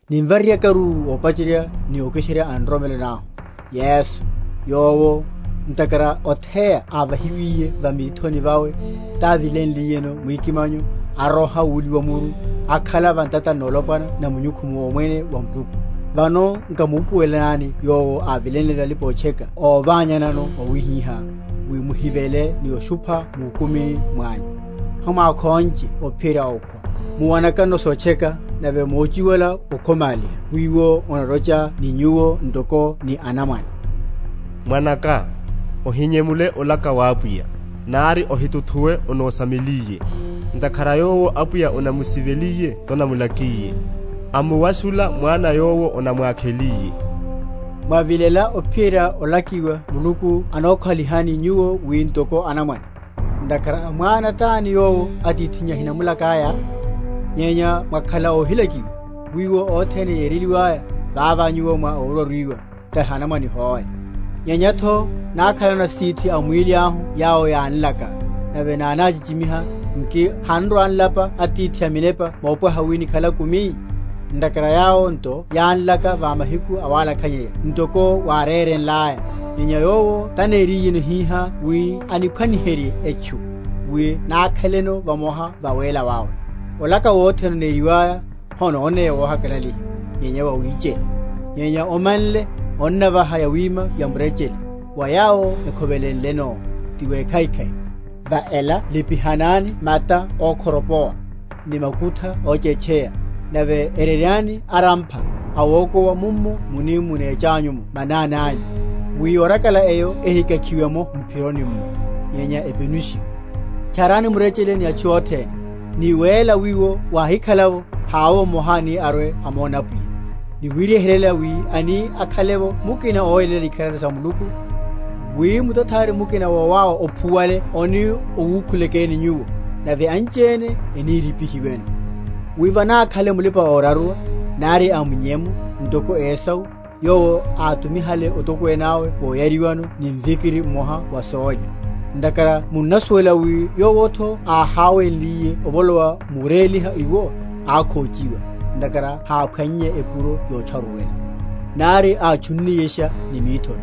nimvareryakaru ópachererya ni ókiserya a nroromelo nahu, Yesu, yowo, ntakhara otheya ávahiwiye va mithoni vawe, távilenliyeno mwikimanyo, aroha wuliwa muru, akhala va ntatani nolopwana na munyukhu womwene wa Muluku. Vano nkamupuweleleni Yowo ávilenleno alipa‐otcheka óványanano mwawihiha, wi muhivele ni oshupha múkumini mwanyu. Hamukhónche ophiyerya okhwa, muwanakano sotcheka; nave mochiwala okhomaliha wiwo onalocha ni nyuwo ntoko ni anamwane, Mwanaka, ohinyemule olaka wa Apwiya, Nari ohituthuwe anósameliye; Ntakhara yowo Apwiya anamusiveliye tanamula?-?kiye, Amuwashula mwana yowo anamwákheliye. Mwavilela ophiyerya olakiwa Muluku anokhalihani nyuwo wi ntoko anamwane; ntakhara mwana tani yowo atithinnya ahinamulakiye? Nyenya mwakhala óhilakiwa, wiwo othene yereliwaya, vavá nyuwo mwa óraruiwa, tahi anamwane hoe. Nyenyatho, nákhalano asitithi a mwíli ahu yawo yánlaka, nave nánáchichi?-?miha; nki hanrwa‐nlapa Atithi a minepa mopwaha wi nikhale akumi? Ntakhara yawo nto yánlaka va mahiku awalakhanyeya ntoko wárérelaya; nyenya Yowo taneriyeno hihá wi aniphwanyeryihe etchu, wi nákheleno vamoha va wéla wawe. Olaka wothene, oneriwaya, hononeya wohakalaliha, nyenya wawichela; nyenya omanle, onnavaha yawima yamurechele, wa yawo ekhovelenleno, ti wekhaikhai. Va ela lipihani mata ókhoropowa, ni makutha óchétcheya; nave ereryanyani arampha awokowa mummo muni munecha’mo manani anyu, wi yorakala eyo ehikakhiwe’mo m’phironi’mmo, nyenya epenushiwe. Tcharani murechele ni atchu othene, ni wéla, wiwo, wáhikhala’vo, havovo mmoha ani arwe‐amone Apwiya; ni wiwehererya wi ani akhale’vo mukina óyeléla ikharari sa Muluku, wi mutathari mukina wowáwa ophuwale oni owukhulekeni nyuwo, nave anchiene enírípihiweno; wi vanákhale mulipa‐oraruwa, nari a munyemu, ntoko Esau, yowo átumihale otokwene awe woyariwano ni mvikiri mmoha wa sólya. Ntakhara munnasuwela wi yowotho áháweliye ovolowa muréliha iwo, ákhóchiwa (ntakhara háphwannye epuro yotcharuwela), nari átchunniyesha ni mithori.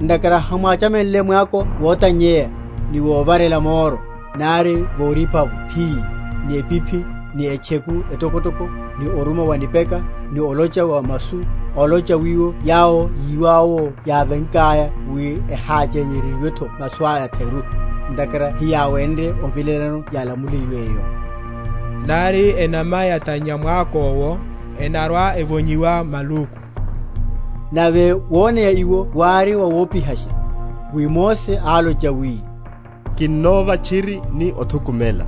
Ntakhara hamwáchamenle mwako wotannyeya, ni wovarela moro, nari vorípa’vo phii, ni epiphi, ni etcheku etokotoko, ni oruma wa nipeka, ni olocha wa masu, olocha wiwo yawo yíwáwo yávenkaya wi eháchereryiwetho masu atheru; ntakhara heyáwenrye ovilelano yálamuliwéyo. Nari enama yatannya mwakówo, enarwa‐evonyiwa maluku; nave woneya iwo wári wawopihasha, wi Mose álocha wi, Kinnova tchiri ni othukumela.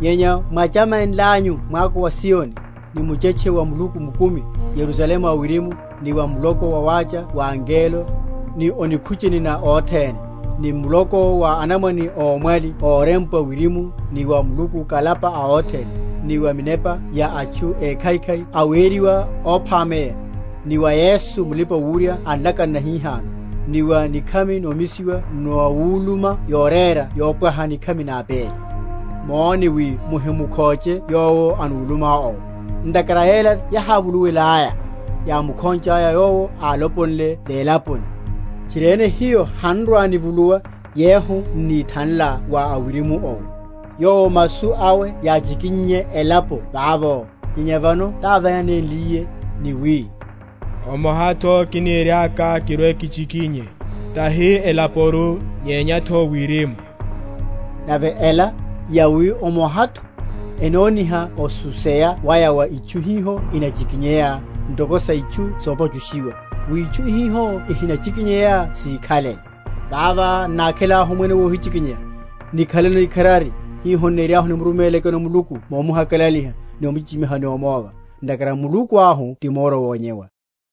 Nyenya mwáchamenlanyu mwako wa Ziyoni, ni muchetche wa Muluku mukumi, Yerusalemu a wirimu, ni wa muloko wawácha wa angelo, ni o nikhucheni na othene, ni muloko wa anamwane ómwali órempwa wirimu ni wa Muluku Kalapa a othene, ni wa minepa ya atchu ékhaikhai aweriwa óphameya, ni wa Yesu Mulipa‐wurya a nlakano nahihano, ni wa nikhami nomisiwa nawuluma yorera yopwaha nikhami na Abeli. Móne wi muhimukhóche yowo anuluma owo. Ntakhara yala yahávuluiyaya, yámukhonchaya yowo áloponle velaponi, tchiriene hiyo hanrwa‐nivuluwa, yehu n’nithanla wa awirimu owo; yowo masu awe yáchikinnye elapo vavo; nyenya vano távánenliye, ni wi, Omohatho kiniriaka kirwe‐kichikinye, tahi elaporu, nyenyatho wirimu. Nave ela, yawi omohatho, enoníha osuseya waya wa itchu hiho inachikinyeya, ntoko sa itchu sopachushiwa, wi itchu hiho ihinachikinyeya síkhalele. Vavá n’nákhelahu omwene wohichikinyeya, nikhaleno ikharari, hiho n’niriahu nimurumélekeno Muluku momuhakalaliha, ni omuchichimiha ni omova. Ntakhara Muluku ahu ti moro wonyewa.